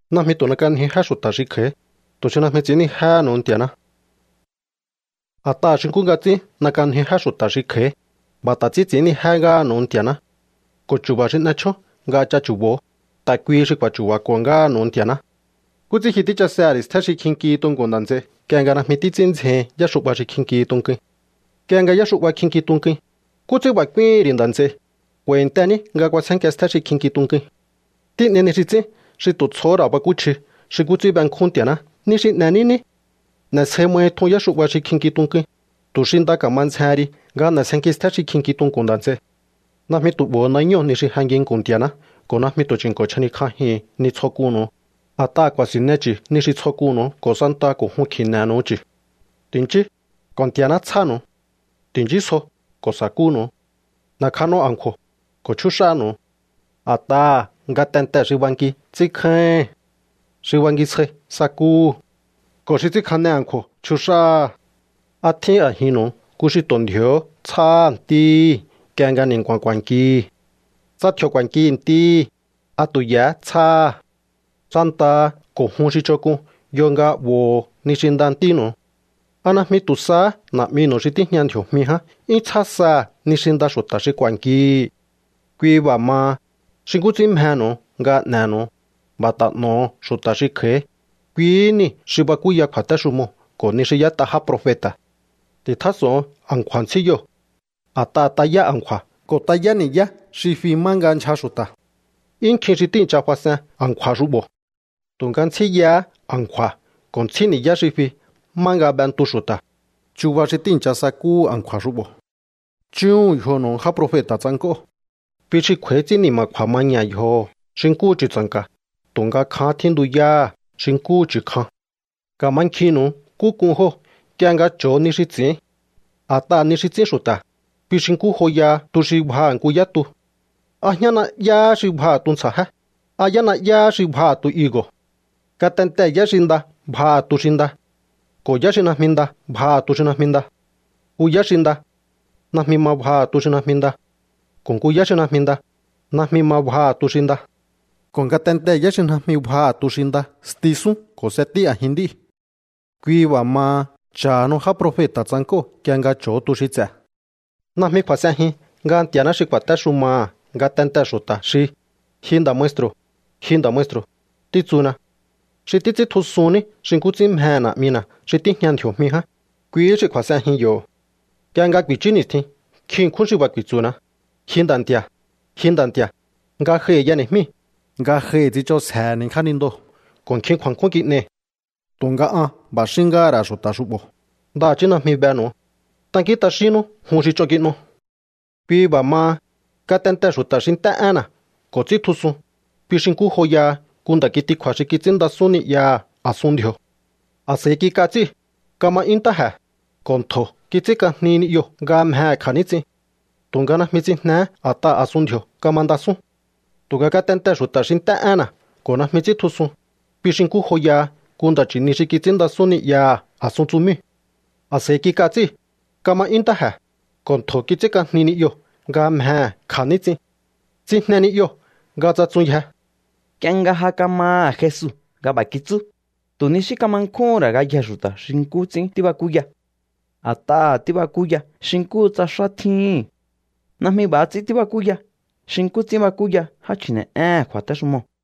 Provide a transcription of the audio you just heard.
’Najmi tu̱ n'ek'anjiu jé xu̱ta̱ xi kj'a̱í, tu̱ xi najmi ts'i̱ínnijéhe̱nu̱u Nti̱a̱ná. A̱t'aha̱ xi nkú nga ts'ín n'e̱k'anjiu jé xu̱ta̱ xi kj'a̱í, b'a̱ ta̱ ts'ín ts'i̱ínnijé ngáha̱nu̱u Nti̱a̱ná. Ko̱ chu̱ba̱ xi n'e̱ chjón nga ch'a̱chu̱bo̱o, ta̱ kuihi xi k'u̱a̱chu̱ba̱ko̱ ngáha̱nu̱u Nti̱a̱ná. ’¿Nkú ts'ín ji tíchasehe̱ ri̱ stjé xi kjinkihi tunku̱n nda̱ nts'ei nk'ie nga najmi títs'ín ndzjehin yáxu'ba xi kjinki tunkuin? Nk'ie nga yáxu'ba kjinki tunkuin, ¿nkú ts'ín b'a̱ k'úíhi̱n ri̱ nda̱ nts'ei: “K'u̱a̱i̱ntení nga k'uasjénkia stjé xi kjinki tunkuin”? Tín'ei ni xi ts'ín xi tu̱ tsjohó ra̱ bakúchji xi nkú ts'ín benkjún Nti̱a̱ná ni xi n'e̱ní ní. N'e̱sje mahi tjun yáxu'ba xi kjinki tunkuin, tu̱ xi nda ka̱ma ndzjehen ri nga n'e̱sjenki stjé xi kjinki tunku̱n nda̱ nts'ei. ’Najmi tu̱ 'bo̱ho̱ nañóo̱ ni xi je nginku̱n Nti̱a̱ná ko̱ najmi tu̱ chi̱nko̱ chjanikj'ajihu̱un ni tsjo k'unnu̱u, a̱t'aha̱ ku̱a̱si̱nne chu̱ ni xi tsjo k'unnu̱u ko̱ santaha ko̱ jun kji̱ne̱nu̱u chu̱. ’Ti̱nchíú, ko̱ Nti̱a̱ná tsjánu̱u. Ti̱nchísjo, ko̱ sa̱kúnu̱u. N'e̱kjano a̱nkju̱o̱, ko̱ chjúx'ánu̱u. A̱t'aha̱ ngatentee̱ xi banki ts'ínkjáíhi̱n. Xi bangisjai sakúhu̱. Ko̱ xi ts'ínkjane a̱nkju̱o̱ chjux'áha̱. ¿A tjín a̱jinnu̱u nku xi tu̱ ndji̱o̱hó tsjáha̱ ntíhi̱ nk'ie nga ni̱nku̱a̱n ku̱a̱nkihi̱? Tsa tji̱o̱ ku̱a̱nki ntíhi̱, ¿a tu̱ ye̱hé tsjáha̱? Santaha ko̱ jun xi ch'onk'un yo nga 'bo̱ho̱o ni xi nda ntínu̱u. ¿A najmi tu̱ sahá Na̱'minu̱u xi tíjña ndji̱o̱jmi ján 'yún tsjá saha̱ ni xi nda xu̱ta̱ xi ku̱a̱nkihi̱? ’Kui b'a̱ maha, xi nkú ts'ín mjenu̱u nga n'e̱nu̱u, b'a̱ ta̱ n'o̱ho̱ xu̱ta̱ xi kj'a̱í. Kuihí niu̱ xi bakúya kju̱a̱téxumoo̱ ko̱ ni xi y'ét'a já profeta̱. ’Ti̱tjás'o̱on a̱nkju̱a̱ ntsjíyoo̱. A̱t'aha̱ tayá a̱nkju̱a̱ ko̱ tayá ni̱yá xi fi má nga ndyja xu̱ta̱. 'Yún nkjin xi tíi̱ncha fas'en a̱nkju̱a̱ xu'bo̱. Tu̱nga ntsjíyahá a̱nkju̱a̱ ko̱ ntsjí ni̱yá xi fi má nga b'entu xu̱ta̱. Chuba xi tíi̱ncha sakúhu̱ a̱nkju̱a̱ xu'bo̱. ’Chúhu̱un yjonu̱u já profeta̱ tsank'óo̱. Kui xi kj'u̱a̱í ts'ín ni̱ma̱kju̱a̱ maña̱ yjoho̱ xi nkúhu chu̱tsa̱nka̱, tu̱nga kjahán tjíntuyáha̱ xi nkúhu chu̱ kjan. Ka̱mankjinnu̱u nkú k'un jóo̱ nk'ie nga cho̱o ni xi ts'i̱ín. A̱t'aha̱ ni xi ts'ín xu̱ta̱, kui xi nkú joyaha tu xi bjaha̱ nku yá tu. ¿A jñá na'yáhá xi bjaha̱ tuntsja̱jé? ¿A yá na'yáhá xi bjaha̱ tu higo̱? Ngatentee̱ yá xi nda bjaha̱ tu xi nda. Ko̱ yá xi najmi nda bjaha̱ tu xi najmi nda. Nku yá xi nda, najmi ma bjaha̱ tu xi najmi nda. Ko̱ nku yá xi najmi nda, najmi ma bjaha̱ tu xi nda. Ko̱ ngatentee̱ yá xi najmi bjaha̱ tu xi nda, stisún ko̱ s'etí a̱jin nd'íu̱. Kui b'a̱ maha, cha̱hanu já profeta̱ tsank'óo̱ nk'ie nga cho̱o tu xi ts'e̱. ’Najmi kju̱a̱s'enjin nga Nti̱a̱ná xi ku̱a̱téxumaha̱ ngatentee̱ xu̱ta̱ xi: “Ji nda̱ maestru̱, ji nda̱ maestru̱”, títsuna. Xi títs'íntjusun ní xi nkú ts'ín mjehe̱ Na̱'mina̱ xi tíjña ndji̱o̱jmi ján, kuihí xi kju̱a̱s'enjin yo̱. Nk'ie nga ku̱i̱chú ni̱stjin nkjin ṉkjún xi b'a̱ ku̱i̱tsu̱na: “Ji Nda̱ Nti̱a̱, ji Nda̱ Nti̱a̱, ngajohi̱ y'eni̱jmíi̱, ngajohi̱ tsich'onsjehe̱ni̱ jánindoo̱ ko̱ nkjin kju̱a̱nkjún kin'ei̱.” Tu̱nga an b'a̱ xín ngáha̱ ra̱ xu̱ta̱ xu'bo̱: “Ndaha̱chí najmi benu̱u. Tankín t'axínnú jun xi ch'on kin'o.” ’Kui b'a̱ maha, ngatentee̱ xu̱ta̱ xi nt'é énna̱ ko̱ ts'íntjusun, kui xi nkú joyaha nku nda̱ kitikju̱a̱ xi kits'ínndasún ni'yaha̱ a̱sun ndji̱o̱. A̱s'a̱i kik'a tsíu̱, kama 'yún ntáje̱, ko̱ ntjo̱ kits'ínk'ajni ni'yoo̱ nga mjehe̱ kja̱níts'in. Tu̱nga najmi tsijnehé a̱t'aha̱ a̱sun ndji̱o̱ kamandasún. Tu̱nga ngatentee̱ xu̱ta̱ xi nt'é énna̱ ko̱ najmi ts'íntjusun, kui xi nkú joyaha nku nda̱ chi̱ni xi kits'ínndasún ni'yaha̱ a̱sun tsumíu̱. A̱s'a̱i kik'a tsíu̱, kama 'yún ntáje̱, ko̱ ntjo̱ kits'ínk'ajni ni'yoo̱ nga mjehe̱ kja̱níts'in. Tsijne ni'yoo̱ nga tsatsunyje. Nk'ie nga ja kamaha̱ Jesu nga b'a̱ kitsú, tu̱ ni xí kama nkjúhún ra̱ ngayjee̱ xu̱ta̱ xi nkú ts'ín tíbakúya. A̱t'aha̱ tíbakúya xi nkúhu tsa xá tjíhi̱n. Najmi b'a̱ ts'ín tíbakúya xi nkú ts'ín bakúya já chji̱ne̱'éhe̱n kju̱a̱téxumoo̱.